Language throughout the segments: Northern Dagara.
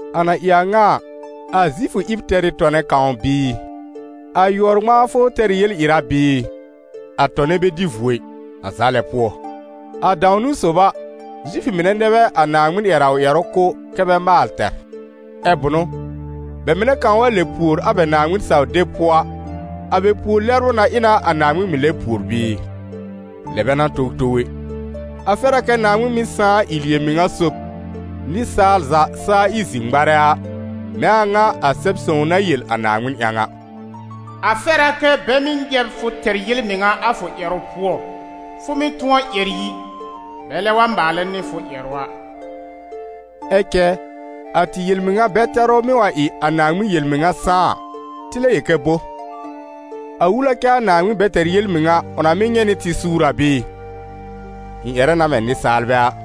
A na ɩ a ŋa a, a Zifʋ ɩb tɛr ɩ tɔnɛ kãw bɩɩ? A yʋɔr-ŋmãafʋ tɛr ɩ yel-ɩra bɩɩ? A tɔnɛ bɛ dɩ vuo ɩ, a za lɛ pʋɔ. A dãw-niwn sob a, Zifʋ mɩnɛ nɛ bɛ a Naaŋmɩn ƴɛr a ʋ ƴɛrʋ kʋ̀ kɛ́ bɛ maal tɛr. Ɛ bʋnʋ? Bɛ mɩnɛ kãw wa lɛb pùor a bɛ Naaŋmɩn-saw-deb pʋɔ a, a bɛ pùor-lɛbrʋ na ɩ na a Naaŋmɩn mɩ̀ lɛb pùor bɩɩ? Lɛ bɛ n'a towtow ɛ! A fɛr a kɛ Naaŋmɩn mɩ́ sãá ɩ yel-mɩŋa sob, nɩsaal za saa ɩ zi-ŋmarɛ a, mɛ̃ a ŋa a Sɛb-sõw na yel a Naaŋmɩn ƴãw a: «A fɛr a kɛ bɛ mɩ́ nyɛ̃ b fʋ tɛr yel-mɩŋa a fʋ ƴɛrʋ pʋɔ, fʋ mɩ́ tʋ̃ɔ ƴɛr yi, bɛlɛ wa maalɛ nɩ fʋ ƴɛrʋ a.» Ɛ cɛ a tɩ yel-mɩŋa bɛ-tɛrʋ mɩ́ wa ɩ a Naaŋmɩn yel-mɩŋa sãá a, tɩ lɛ yel kɛ bo? A wul a kɛ a Naaŋmɩn bɛ tɛr yel-mɩŋa ʋ na mɩ́ nyɛ̃ nɩ tɩ suur a bɩɩ? (Ɩ̃ ƴɛrɛ na mɛ̃ nɩsaalbɛ a.)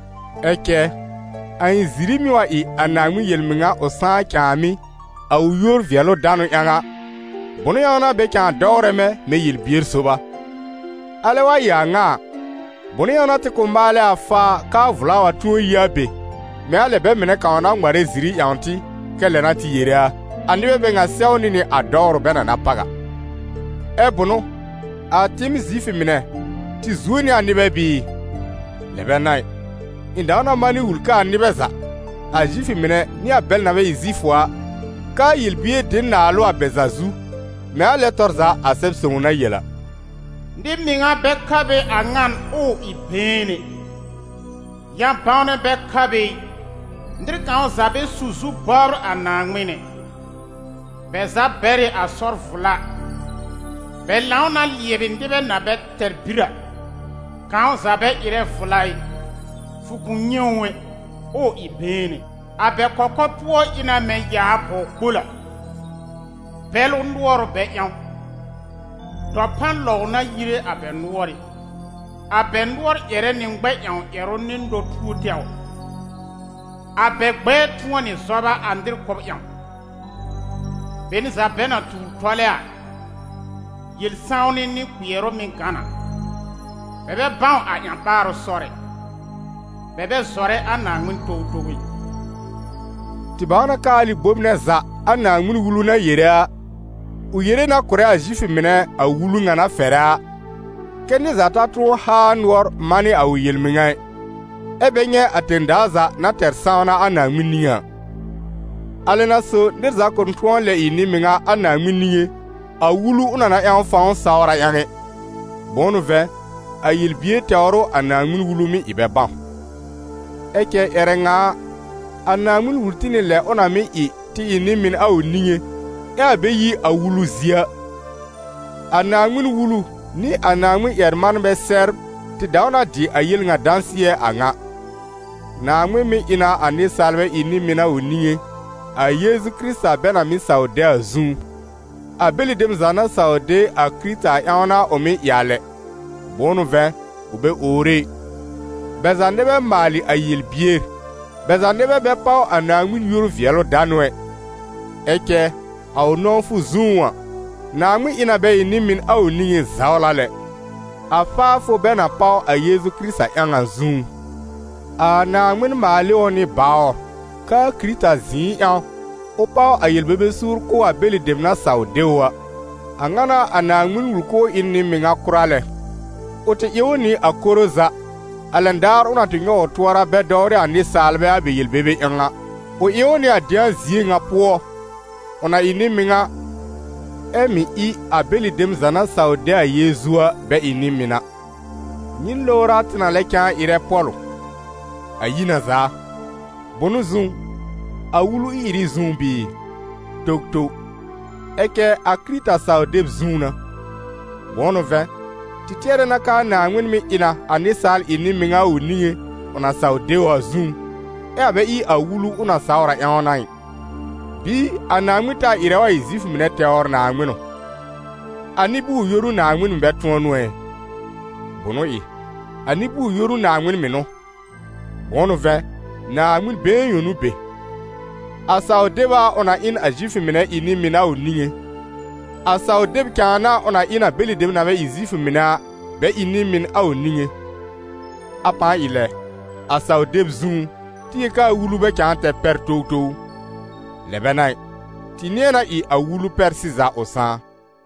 Ɛ cɛ, a ɩ̃ ziri mɩ́ wa ɩ a Naaŋmɩn yel-mɩŋa ʋ sãá cãàmɩ́, a ʋ yúor-vɩɛlʋ-danʋ ƴãw a, bʋnʋ ƴãw n'a bɛ cãa dɔwrɛ mɛ̃, mɛ̃ yel-bier sob a? Alɛ wa ɩ a ŋa a, bʋnʋ ƴãw n'a tɩ kʋ̃ maalɛ a faa k'aa vla wa tʋ̃ɔ yi a be, mɛ̃ a lɛ bɛ mɩnɛ kãw na ŋmarɛ ziri ƴãwn tɩ kɛ́ lɛ n'a tɩ yere a? A nɩbɛ bɛ ŋa sɛwnɩ nɩ a dɔwrʋ bɛ na na páw a. Ɛ́ bʋnʋ? A tɩɩm Zifʋ mɩnɛ, tɩ zuo nɩ a nɩbɛ bɩɩ? Lɛ bɛ n'a ɩ! Ɩ̃ dãw na manɩ wul k'aa nɩbɛ za, a Zifʋ mɩnɛ nɩ a bɛl na bɛ ɩ Zifʋ a, k'aa yel-bier dɩ n naalʋ a bɛ za zu, mɛ̃ a lɛ tɔr za a Sɛb-sõw na yel a: «Nɩ-mɩŋa bɛ ka be a ŋan ʋʋ ɩ been ɛ, ƴã-bãwnɛ bɛ ka be ɩ, nɩr kãw za bɛ su zu bɔbr a Naaŋmɩn ɛ. Bɛ za bɛr ɩ a sɔr vla, bɛ lãw na lɩɛbɩ nɩbɛ na bɛ tɛr bir a. Kãw za bɛ ɩrɛ vla ɩ, fʋ kʋ̃ nyɛ̃ ʋ, ʋʋ ɩ been ɛ. A bɛ kɔkɔrpʋɔ ɩ na mɛ̃ yaa bɔw-kpol a, bɛlʋ nʋɔr ʋ bɛ ƴãw, dɔpan lɔw n'a yire a bɛ nʋɔrɩ́, a bɛ nʋɔr ƴɛrɛ nɩ ŋmɛ-ƴãw ƴɛrʋ nɩ nɔ-tuo tɛwr. A bɛ gbɛɛ tʋ̃ɔ nɩ zɔba a nɩr kʋ́b ƴãw, be n za bɛ na tuur tɔlɛ a, yel-sãwnɩ nɩ kpɩɛrʋ mɩ́ gã na, bɛ bɛ bãw a ƴã-ɓaarʋ sɔr ɛ. Bɛ bɛ zɔrɛ a Naaŋmɩn towtow ɛ.» Tɩ bãw na k'aa alɩ bome nɛ za a Naaŋmɩn-Wulu na yere a, ʋ yere na kʋ̀rɛ a Zifʋ mɩnɛ a Wulu ŋa na fɛrɛ a, kɛ́ nɩr za ta tʋ̃ɔ haa nʋɔr manɩ a ʋ yel-mɩŋa ɩ, ɛ́ bɛ nyɛ̃ a tẽ-daa za na tɛr sãwna a Naaŋmɩn niŋé a. A lɛ n'a so nɩr za kʋ̃ tʋ̃ɔ lɛ ɩ nɩ-mɩŋa a Naaŋmɩn niŋé, a Wulu ʋ na na ƴãw fãw sawr a ƴãw ɛ; bʋ̃ʋ n'ʋ vɛ̃, a yel-bier tɛwr ʋ a Naaŋmɩn-Wulu mɩ́ ɩ bɛ bãw. Ɛ cɛ ƴɛrɛ ŋa a, a Naaŋmɩn wul tɩ nɩ a lɛ ʋ na mɩ́ ɩ tɩ ɩ nɩ-mɩn a ʋ niŋé, ɛ a bɛ yi a Wulu zie a. A Naaŋmɩn-Wulu nɩ a Naaŋmɩn-ƴɛr-manbɛ sɛbr tɩ dãw na dɩ a yel ŋa dãsɩɛ a ŋa: Naaŋmɩn mɩ́ ɩ na a nɩsaalbɛ ɩ nɩ-mɩn a ʋ niŋé, a Yeezu Kɩrɩta bɛ na mɩ́ saw de a zũú. A bɛlɩ dem za na saw de a Kɩrɩta a ƴãw n'a ʋ mɩ́ ɩ a lɛ, bʋ̃ʋ n'ʋ vɛ̃, ʋ bɛ owre ɩ: bɛ za nɛ bɛ maalɩ a yel-bier, bɛ za nɛ bɛ bɛ páw a Naaŋmɩn yúor-vɩɛlʋ-danʋ ɛ. Ɛ cɛ, a ʋ nɔ̃wfʋ zũú a, Naaŋmɩn ɩ na bɛ ɩ nɩ-mɩn a ʋ niŋé zawla lɛ, a faafʋ bɛ na páw a Yeezu Kɩrɩta ƴãw a zũú. A Naaŋmɩn maal ɩ ʋ nɩ bawr, k'aa Kɩrɩta zɩ̃ɩ ƴãw, ʋ páw a yel-bebe suur kʋ̀ a bɛlɩ dem na saw de ʋ a. A ŋa n'a a Naaŋmɩn wul k'ʋʋ ɩ n nɩ-mɩŋa kʋra lɛ: ʋ tɩ ɩ ʋ nɩ a koro za, a lɛn daar ʋ na tɩ nyɔw ʋ tʋɔra bɛ dɔwrɩ a nɩsaalbɛ a bɛ yel-bebe ƴãw a; ʋ ɩ ʋ nɩ a dɩ̃a zie ŋa pʋɔ, ʋ na ɩ nɩ-mɩŋa, ɛ mɩ̀ ɩ a bɛlɩ dem za na saw de a Yeezu a bɛ ɩ nɩ-mɩn a. Nyɩn lowr a tɩ na lɛ cãa ɩrɛ pɔ̀lʋ? A yi na zaa! Bʋnʋ zũú? A Wulu ɩ-ɩrɩ zũú bɩɩ? Towtow! Ɛ cɛ a Kɩrɩta saw-deb zũú n'a. Bʋ̃ʋ n'ʋ vɛ̃, tɩ tɩɛrɛ na k'aa Naaŋmɩn mɩ́ ɩ na a nɩsaal ɩ nɩ-mɩŋa a ʋ niŋé ʋ na saw de a zũú, ɛ a bɛ ɩ a Wulu ʋ na sawr a ƴãw n'a ɩ. Bɩɩ a Naaŋmɩn taa ɩrɛ wa ɩ Zifʋ mɩnɛ tɛwr Naaŋmɩn ʋ? A nɩ-bʋʋr-yoru Naaŋmɩn mɩ̀ bɛ tʋ̃ɔ n'ʋ ɛ? Bʋnʋ ɩ! A nɩ-bʋʋr-yoru Naaŋmɩn mɩ̀ n'ʋ, bʋ̃ʋ n'ʋ vɛ̃, Naaŋmɩn been yõ n'ʋ be. A saw-deb a ʋ na ɩ n a Zifʋ mɩnɛ ɩ nɩ-mɩn a ʋ niŋé, a saw-deb cãa n'a ʋ na ɩ n a bɛlɩ dem na bɛ ɩ Zifʋ mɩnɛ a, bɛ ɩ nɩ-mɩn a ʋ niŋé. A pãa ɩ lɛ, a saw-deb zũú, tɩ yel k'aa Wulu bɛ cãa tɛr pɛr towtow ʋ? Lɛ bɛ n'a ɩ, tɩ nɩ̃ɛ na ɩ a Wulu pɛr sɩza ʋ sãá.